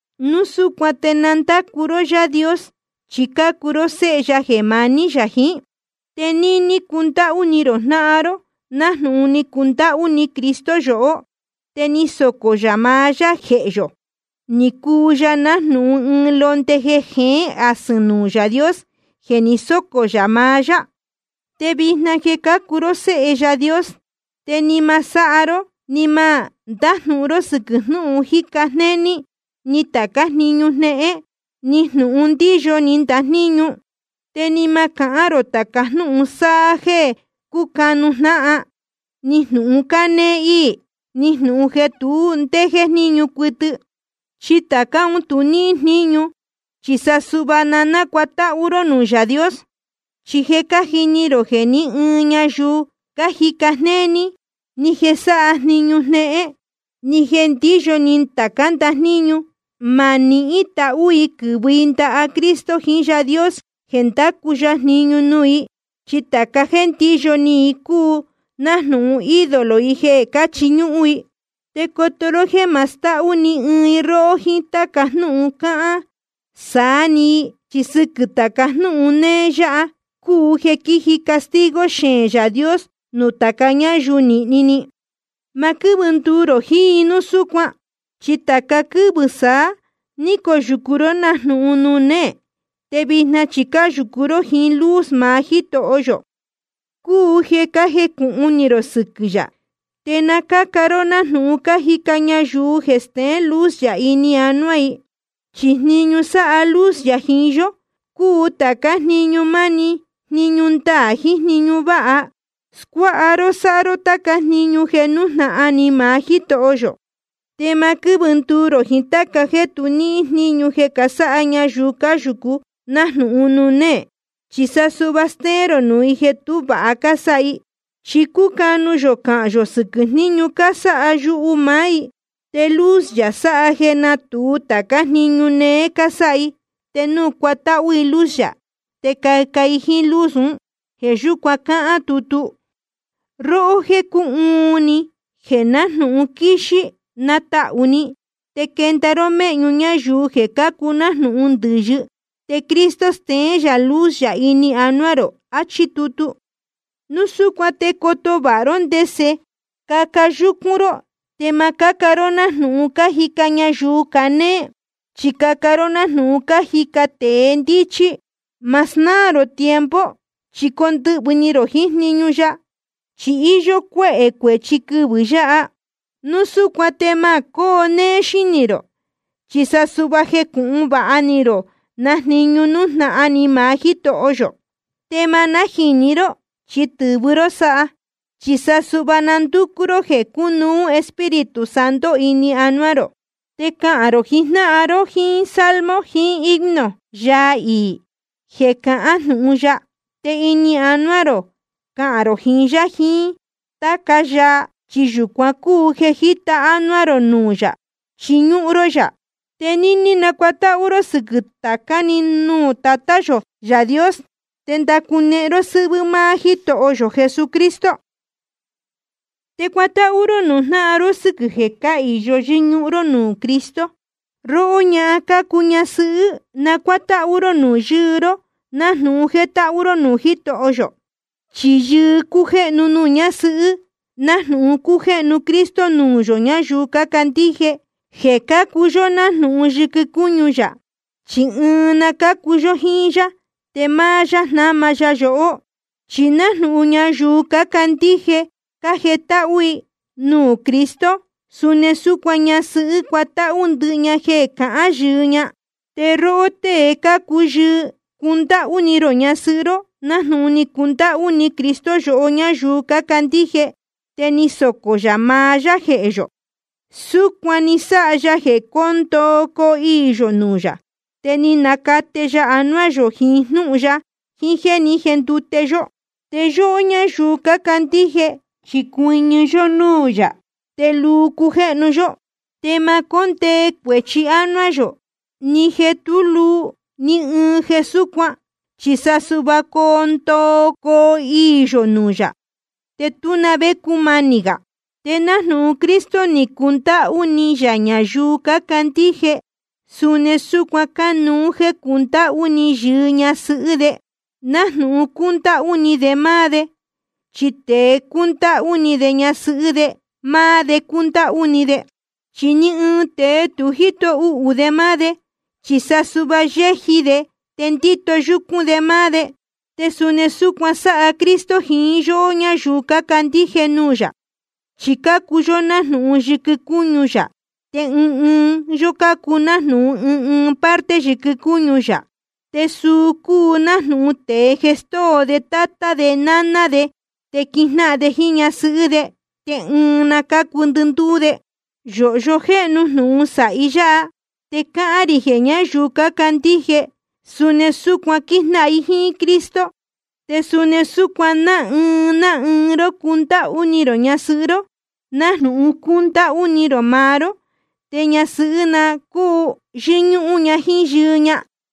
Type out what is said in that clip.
Núu súcuan te na ndácu ró Yaā Dios, chi cácuu ró séhe ya jeē maní yā jiín. Te níní cundáhú ni rō jnáhan ró, nájnūhun ni cundáhú ni Cristo yohó, te ni socō yā maá yá jehē yō, ni cuu ya nájnūhun ɨɨn londe jeē jeén asɨ̄n nuū Yaā Dios jeē ni sócō yā maá yá. Te vijna jeē cácuu ró séhe Yaā Dios, te ni ma sáha ró ni ma ndájnūhun ró sɨ́quɨ̄ jnūhun jíca jnéní, ni tācá jniñu jnéhén, ni jnūhun ndíyo ni ndajníñu. Te ni ma cahán rō tāca jnúhun sáha jeē cúcanu jnáhan, ni jnūhun cánéé íī, ni jnūhun jeē tu ndé jéjníñu cuɨtɨ. Chi tācá un tu níhín jníñu. Chi sa suhva na nácuatáhú ró nuū Yaā Dios. Chi je cájini rō jeē ní ɨɨn ñayuu cájica jnéní, ni jeē sáha jniñu jnéhén, ni jeē ndíyo ni tācá ndajníñu, ma nihín tahú i quɨ̄vɨ i ndaha Cristo jiín Yaā Dios jeē ndacu ya jniñu nuū i. Chi tāca jéē ndíyo ni i cúu nájnūhun ídolo i jeē cáchiñúhún i. Te coto ró jéē ma stahú ni ɨɨn i róhó jíín táca jnúhun cáhán saá ni i, chi sɨquɨ̄ tāca jnúhun néé yáha cúu jeē quíji castigo xeēn Yaā Dios nuū tāca ñáyuu nīhni ni. Ma quɨ́vɨ nduu rō jiín i núu súcuan. Chi tāca quɨ́vɨ saá ni coyūcu ró nájnūhun nuū néē, te vijna chi cáyūcu ró jíín luz maá Jítoho yō, cúu jeē cájecūhun ni rō sɨquɨ̄ yā. Te na cáca ró nájnūhun cájica ñayuu jeē steén luz yā ini anuá i. Chi jniñu sáha luz yā jiín yó cúu tācá jniñu manī ni, jniñu ndaā, jiín jniñu váha. Scuáha ró sáha ró táca jniñu jeē nújnahan ni maá Jítoho yō. Te ma quɨ́vɨ nduu rō jiín táca jeē tu níhín jníñu jeē casáha ñayuu cáyūcu nájnūhun nuū néē. Chi sa suhva stéén rō nuū i jeē tú vāha cásáha i. Chi cúcanu yō cahān yō sɨquɨ̄ jníñu cásáha yuhu maá i. Te luz yā sáha jeē nátūu tācá jniñu néé cásáha i. Te núu cuatáhú i luz yā te caca i jíín luz ún. Jeē yúcuan cáhán tutu: Róhó jeē cúhuun ni, jeē nájnūhun quíxí, natahū ni, te quenda ró méhñu ñáyuu jeē cácuu nájnūhun ndɨ̄yɨ. Te Cristo steén yā luz yā ini anuá rō. Achí tutu. Núu súcuan te coto vāha ró ndese caca yúcún ró. Te ma cáca ró nájnūhun cájica ñayuu canéé, chi caca ró nájnūhun cájica tēe ndíchí. Ma snáā rō tiempo, chi condɨhvɨ̄ ni rō jiín jniñu ya, chi íyó cuéhē cuēchi quɨvɨ̄ yáha. Núu súcuan te ma cóo néé xínī rō, chi sa suhva na jécūhun vāha ni rō na jniñu nújnahan ni maá Jítoho yō. Te ma nájīni ró, chi tɨ̄vɨ ró sáha. Chi sa suhva na ndúcú ró jeē cúnuú Espíritu Santo ini anuá rō. Te cahān rō jiín jnáhan ró jíín salmo jiín himno, yaa iī jeē cahán jnūhun ya. Te ini anuá rō cahān rō jiín yá jiín táca yaa, chi yūcuan cúu jeē jíta ánuá rō nuū yā chíñúhún ró yā. Te níní nacuatáhú ró sɨquɨ̄ tācá‑ni nuū Tatá yō Yaā Dios te ndacunehen ró sɨ́hvɨ́ máá Jítoho yō Jesucristo. Te cuatáhú ró nuū jnáhan ró sɨ́quɨ̄ jeē cáhīyo yɨ́ñúhún ró nuū Cristo. Róhó ñahan cácuu ñasɨhɨ́, cuatáhú ró nuū yɨɨ ró, nájnūhun jétáhú ró nuū Jítoho yō. Chi yɨɨ cújéhnu nuū ñásɨhɨ́, nájnūhun cújéhnu Cristo nuū yohó ñáyuu cácandíje, jeē cácuu yó nájnūhun yɨquɨ cúñu yā, chi ɨɨn na cúu yó jiín yá. Te máá yá jnáma ya yohó. Chi nájnūhun ñayuu cácandíje cájetáhú i nuū Cristo, suni súcuan ñasɨhɨ́ cuatáhú ña ndɨhɨ jeē cahán yɨɨ ña. Te róhó tée cácuu yɨɨ, cundáhú ni rō ñasɨhɨ́ ró, nájnūhun ni cundáhú ni Cristo yohó ñáyuu cácandíje, te ni socō yā maá yá jehē yō. Súcuan ni sáha ya jeē cóo ndoo coo iī yō nuū yā, te ni nacate ya anuá yō jiín jnúhun ya jiín jéē ní jendute yó. Te yóhó ñáyuu cácandíje chi cuɨñɨ yó núū yā, te luu cujéhnu yó. Te ma cóndee cuēchi ánuá yō, ni jeē tú luu, ni ɨɨn jeē súcuan, chi sa suhva coo ndoo coo iī yō nuū yā, te tú na vé cumanī gā. Te nájnūhun Cristo ni cundáhú ni yā ñayuu cácandíje, suni súcuan cánuú jéē cundáhú ni yɨɨ ñasɨhɨ́ de, nájnūhun cúndáhú ni de máá de. Chi tēe cúndáhú ni de ñasɨhɨ́ de, máá de cúndáhú ni de. Chi ni ɨɨn tēe tu jíto uhū de máá de, chi sa suhva yéji de te ndíto yúcún de máá de. Te suni súcuan sáha Cristo jiín yóhó ñáyuu cácandíje nuū yā. Chi cácuu yó nájnūhun yɨquɨ cúñu yā, te ɨɨn ɨɨn yó cácuu nájnūhun ɨɨn ɨɨn parte yɨquɨ cúñu yā. Te suu cúu nájnūhun tēe jeē stóo de tátá de náná de, te quijnáhan de jíín ñasɨhɨ́ de, te ɨɨn na cúu ndɨndúú de. Yōhyo jéhnu jnūhun sāhi yáha, te cáhán rī jeē ñáyuu cácandíje suni súcuan quíjnáhan i jíín Cristo. Te suni súcuan ná ɨɨn ná ɨɨn ró cundáhú ni rō ñasɨhɨ́ ró, nájnūhun cúndáhú ni rō maá ró. Te ñasɨhɨ́ na cúu yɨ́ñúhún ña jíín yɨɨ ña.